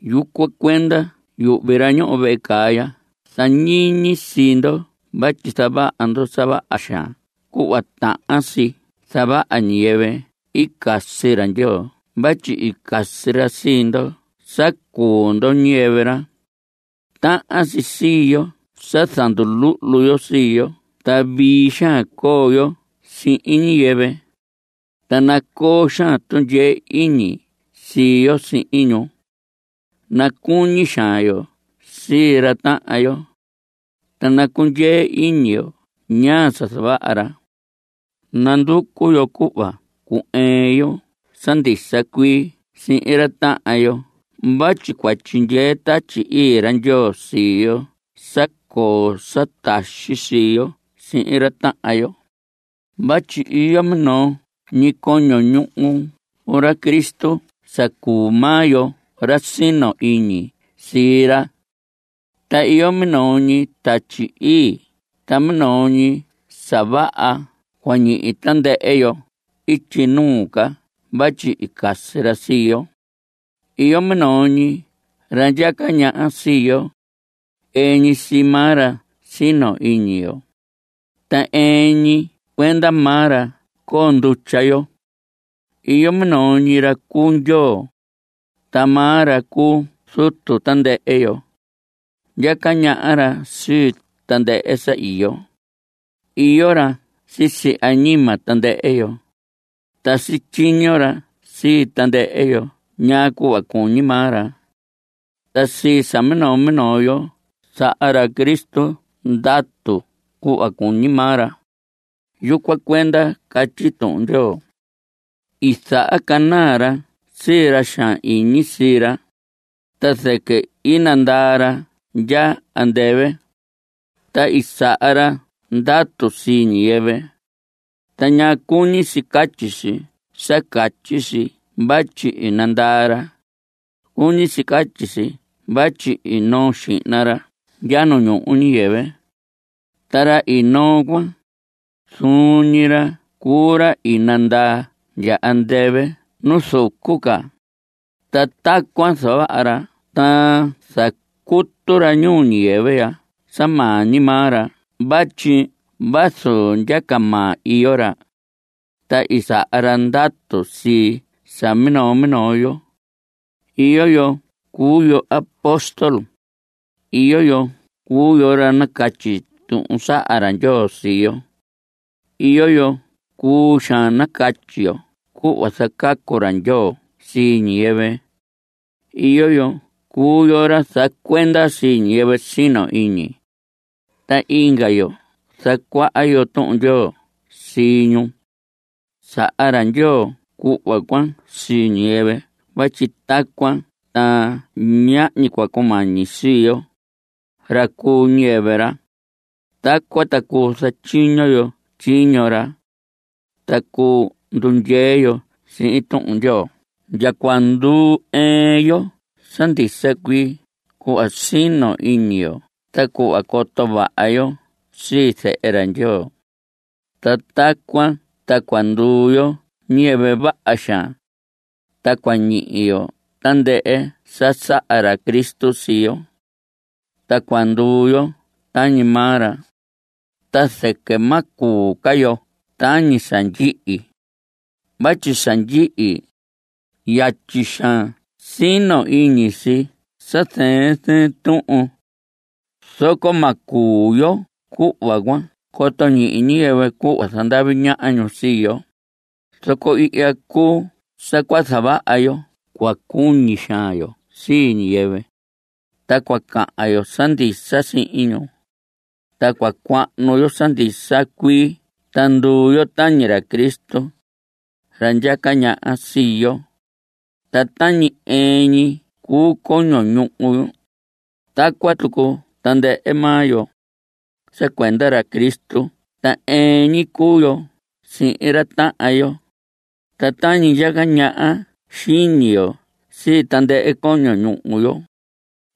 Yucuan cuenda yuhvi ra ñoho vehe caa ya zañiñi sii ndo vatyi zavaha ndo sa vaha xaan cuhva tahan si zavaha ñiyɨvɨ i casi ra Ndyoo vatyi i casi ra sii ndo sa cuu ndo ñiyɨvɨ ra. Tahan si sii yo sa zanduluhlu yo sii yo ta vii xaan coo yo sihin ñiyɨvɨ, ta nacoo xaan tundyee iñi sii yo sihin ñu. Nacuñi xaan yo sii ra tahan yo, ta nacundyee iñi yo ñaa sa zavaha ra. Nanducu yo cuhva cu‑ɨɨn yo sa ndisa cuii sihin ra tahan yo vatyi cua tyindyee Tatyi Ii ra Ndyoo sii yo sa coo sa taxi sii yo sihin ra tahan yo. Vatyi iyo minoo ñi coño ñuhu ra Cristo sa cuu maa yo ra sino iñi sii ra, ta iyo minoo ñi Tatyi Ii ta minoo ñi sa vaha cua ñihi tandɨhɨ yo ityi nuu ca vatyi i casi ra sii yo. Iyo minoo ñi ra ndyaca ñaha sii yo. Ɨɨn ñi sii maa ra sino iñi yo. Ta ɨɨn ñi cuenda maa ra coo ndutya yo. Iyo minoo ñi ra cuu Ndyoo, ta maa ra cuu Zutu tandɨhɨ yo. Ndyaca ñaha ra sii tandɨhɨ sa iyo. Iyo ra sisi añima tandɨhɨ yo, ta sityiño ra sii tandɨhɨ yo ñaa cuhva cuñi maa ra. Ta sii sa minoo minoo yo saha ra Cristo ndatu cuhva cuñi maa ra. Yucuan cuenda catyi Tuhun Ndyoo: I zahacanaa ra sii ra xaan iñi sii ra, ta zɨquɨ i nandaa ra ndya andɨvɨ, ta i saha ra ndatu sii ñiyɨvɨ. ¿Ta ñaa cuñi si catyi si sa catyi si vatyi i nandaa ra? Cuñi si catyi si vatyi i noo xihna ra ndya ñuu ñiyɨvɨ. Ta ra i noo cuan, zuun ñi ra cuu ra i ndaa ndya andɨvɨ nu zucu ca. Ta tacuan zavaha ra ta zacutu ra ñuu ñiyɨvɨ ya sa maa ñi maa ra vatyi vazu ndyaca maa, iyo ra. Ta i saha ra ndatu sii sa minoo minoo yo. Iyo yo cuu yo apóstol. Iyo yo cuu yo ra nacatyi tuhun saha ra Ndyoo sii yo. Iyo yo cuu xaan nacatyi yo cuhva zacacu ra Ndyoo sii ñiyɨvɨ. Iyo yo cuu yo ra zacuenda sii ñiyɨvɨ sino iñi, ta inga yo zacuaha yo Tuhun Ndyoo sii ñu. Saha ra Ndyoo cuhva cuan sii ñiyɨvɨ vatyi tacuan ta ñahñi cua cumañi sii yo, ra cuu ñiyɨvɨ ra. Tacuan ta cuu zatyiño yo tyiño ra, ta cuu ndundyee yo sihin Tuhun Ndyoo ndya cua ndu‑ɨɨn yo sa ndisa cuii cuhva sino iñi yo ta cuhva coto vaha yo sii Zehe ra Ndyoo. Ta tacuan ta cua nduu yo ñiyɨvɨ vaha xaan, ta cua ñihi yo tandɨhɨ sa saha ra Cristo sii yo, ta cua nduu yo tañi maa ra. Ta zɨquɨ ma cuu ca yo tañi sa ndyihi. Vatyi sa ndyihi, yatyi xaan sino iñi si sii sa zɨɨn zɨɨn tuhun. Zoco ma cuu yo cuhva cuan coto ñihi ñiyɨvɨ cuhva zandavi ñaha ñu sii yo. Zoco ihya cuu sa cua zavaha yo; cua cuñi xaan yo sii ñiyɨvɨ, ta cua cahan yo sa ndisa sihin ñu, ta cua cuahnu yo sa ndisa cuii ta nduu yo tañi ra Cristo, ra ndyaca ñaha sii yo. Ta tañi ɨɨn ñi cuu coño ñuhu yo, tacuan tucu tandɨhɨ maa yo. Sa cuenda ra Cristo ta ɨɨn ñi cuu yo sihin ra tahan yo. Ta tañi ndyaca ñaha xiñi yo sii tandɨhɨ coño ñuhu yo,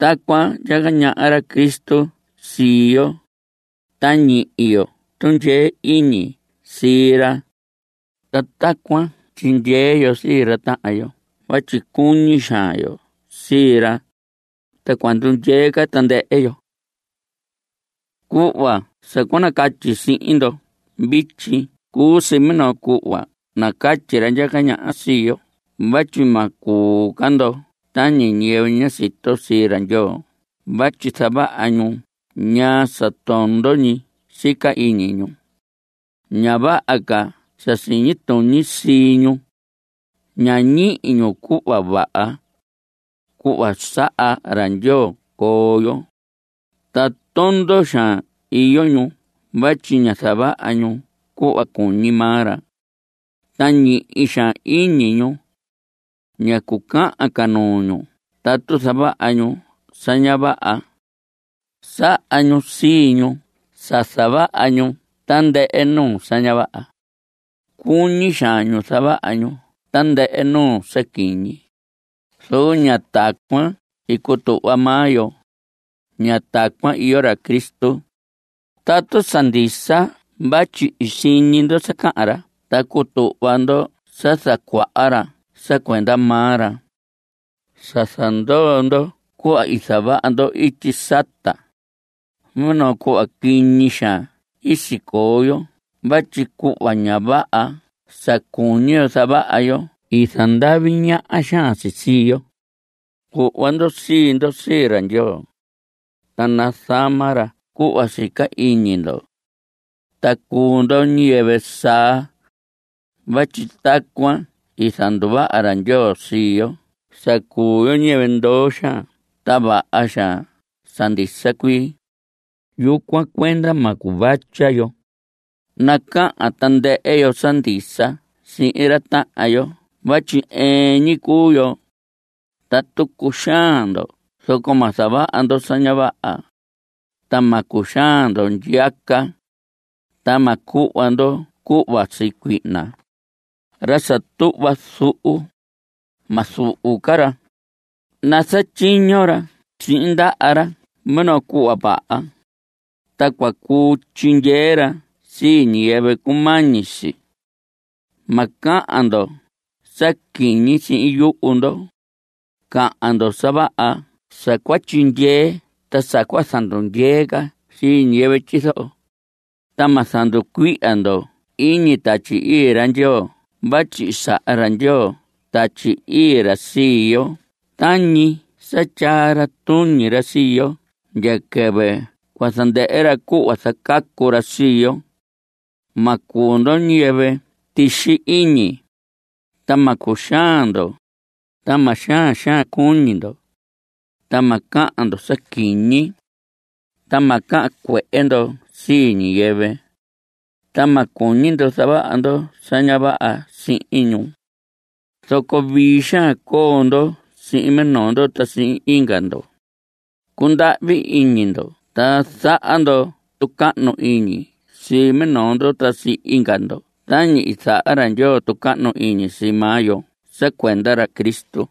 tacuan ndyaca ñaha ra Cristo sii yo, ta ñihi yo tundyee iñi sii ra. Ta tacuan tyindyee yo sii ra tahan yo vatyi cuñi xaan yo sii ra, ta cua ndundyee ca tandɨhɨ yo. Cuhva sa cua nacatyi sihin ndo vityi cuu si minoo cuhva nacatyi ra ndyaca ñaha sii yo vatyi ma cuu ca ndo tañi ñiyɨvɨ ña sito sii ra Ndyoo vatyi zavaha ñu ñaa sa tondo ñi sica iñi ñu. Ña vaha ca sa siñi tuñi sii ñu. Ña ñihi ñu cuhva vaha, cuhva saha ra Ndyoo coo yo. Ta tondo xaan iyo ñu vatyi ña zavaha ñu cuhva cuñi maa ra, ta ñihi xaan iñi ñu. Ña cucahan ca nuu ñu tatu zavaha ñu sa ña vaha. Saha ñu sii ñu sa zavaha ñu tandɨhɨ nuu sa ña vaha. Cuñi xaan ñu zavaha ñu tandɨhɨ nuu sa quiñi. Zoco ña tacuan i cutuhva maa yo. Ña tacuan iyo ra Cristo. Tatu sa ndisa vatyi i siñi ndo sa cahan ra ta cutuhva ndo sa zacuaha ra sa cuenda maa ra, sa zandoo ndo cuhva i zavaha ndo ityi sata. Minoo cuhva quiñi xaan i sicoo yo vatyi cuhva ña vaha sa cuñi yo zavaha yo i zandavi ñaha xaan si sii yo. Cuhva ndo sii ndo sii ra Ndyoo, ta nazama ra cuhva sica iñi ndo. Ta cuu ndo ñiyɨvɨ saa, vatyi tacuan i zanduvaha ra Ndyoo sii yo sa cuu yo ñiyɨvɨ ndoo xaan ta vaha xaan sa ndisa cuii. Yucuan cuenda ma cuvatya yo. Nacahan tandɨhɨ yo sa ndisa sihin ra tahan yo vatyi ɨɨn ñi cuu yo. Tatu cuxaan ndo zoco ma zavaha ndo sa ña vaha, ta ma cuxaan ndo ndyiyaca. Ta ma cuhva ndo cuhva sii cuihna. Ra sa tuhva zuhu, ma zuhu ca ra. Nazatyiño ra sihin ndaha ra minoo cuhva vaha, ta cua cuu tyindyee ra sii ñiyɨvɨ cumañi si. Ma cahan ndo sa quiñi sihin yuhu ndo. Cahan ndo sa vaha sa cua tyindyee ta sa cua zandundyee ca sii ñiyɨvɨ tyizoho. Ta ma zanducuihya ndo iñi Tatyi Ii ra Ndyoo vatyi i saha ra Ndyoo Tatyi Ii ra sii yo tañi sa tyaa ra tuñi ra sii yo ndya quɨvɨ cua zandɨhɨ ra cuhva zacacu ra sii yo. Ma cuu ndo ñiyɨvɨ tixi iñi, ta ma cuxaan ndo, ta ma xaan xaan cuñi ndo, ta ma cahan ndo sa quiñi, ta ma cahan cuehe ndo sii ñiyɨvɨ. Ta ma cuñi ndo zavaha ndo sa ña vaha sihin ñu. Zoco vii xaan coo ndo sihin minoo ndo ta sihin inga ndo. Cundahvi iñi ndo ta zaha ndo tucahnu iñi sii minoo ndo ta sii inga ndo tañi i zaha ra Ndyoo tucahnu iñi sii maa yo sa cuenda ra Cristo.